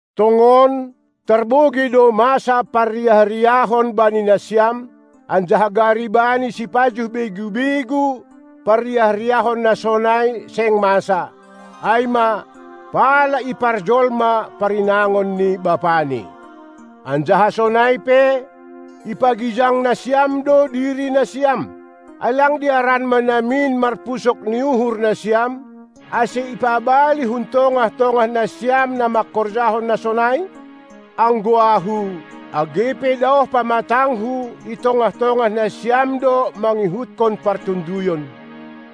Tongon, tarbogei do, masa parriah-riahon bani nasiam, anjaha gari bani sipajuh begu-begu parriah-riahon na sonai seng masa, ai ma, pala iparjolma parinangon ni bapani. Anjaha sonai pe, ipagijang nasiam do diri nasiam. Ai lang dearan ma namin marpusok ni uhur nasiam, ase ipabali hun tongah-tongah nasiam na mangkorjahon na sonai? Anggo ahu, age pe daoh pamatangku, i tongah-tongah nasiam do mangihutkon partonduyon;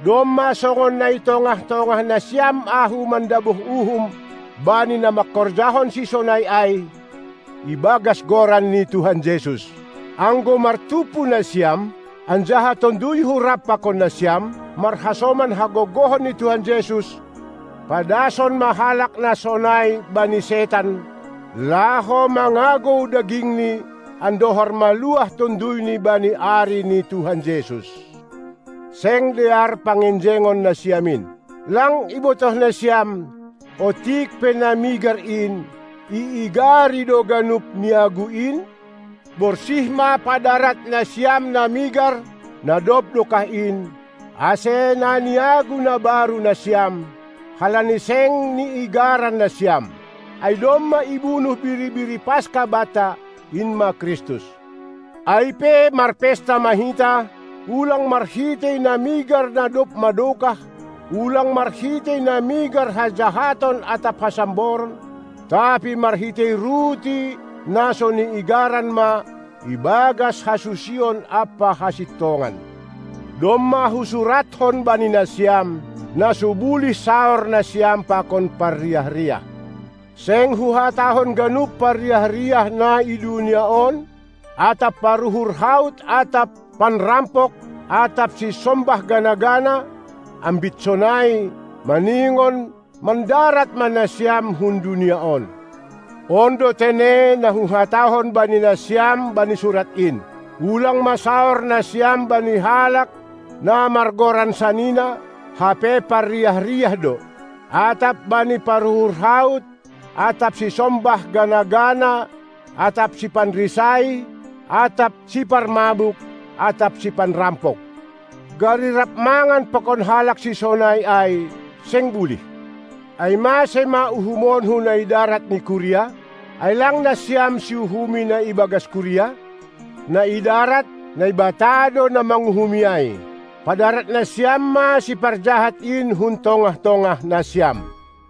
domma songon na i tongah-tongah nasiam ahu mandabuh uhum bani na mangkorjahon sisonai ai, ibagas Goran ni Tuhan Jesus. Anggo martumpu nasiam, anjaha tonduyhu rap pakon nasiam, marhasoman hagogohon ni Tuhanta Jesus, padason ma halak na sonai bani setan, laho mangagou dagingni, andohar maluah tonduyni bani ari ni Tuhan Jesus. Seng dear pangenjengon nasiam in. Lang ibotoh nasiam, otik pe na migar in, iigari do ganup niagu in? Borsih ma padarat nasiam na migar na dob dokah in, ase na niagu na baru nasiam, halani seng niigaran nasiam. Ai domma ibunuh Biri-biri paska banta, in ma Kristus. Ai pe marpesta ma hita, ulang marhitei na migar na dob madokah, ulang marhitei na migar hajahaton atap hasamboron, tapi marhitei ruti na so niigaran ma ibagas hasusion ampa hasintongan. Domma husuratkon bani nasiam, na so bulih saor nasiam pakon parriah-riah. Seng huhatahon ganup parriah-riah na i dunia on atap paruhur haut atap panrampok atap sisombah gana-gana; ambit sonai, maningon mandarat ma nasiam hun dunia on. On do tene na huhatahon bani nasiam bani surat in. Ulang ma saor nasiam bani halak na margoran sanina, hape parriah-riah do, atap bani paruhur haut atap sisombah gana-gana atap sipanrisai atap siparmabuk atap sipanrampok. Gari rap mangan pakon halak sisonai ai seng bulih. Ai mase ma uhumonku na idarat ni kuria? Ai lang nasiam siuhumi na ibagas kuria? Na i darat, Naibata do na manguhumi ai. Padarat nasiam ma siparjahat in hun tongah-tongah nasiam!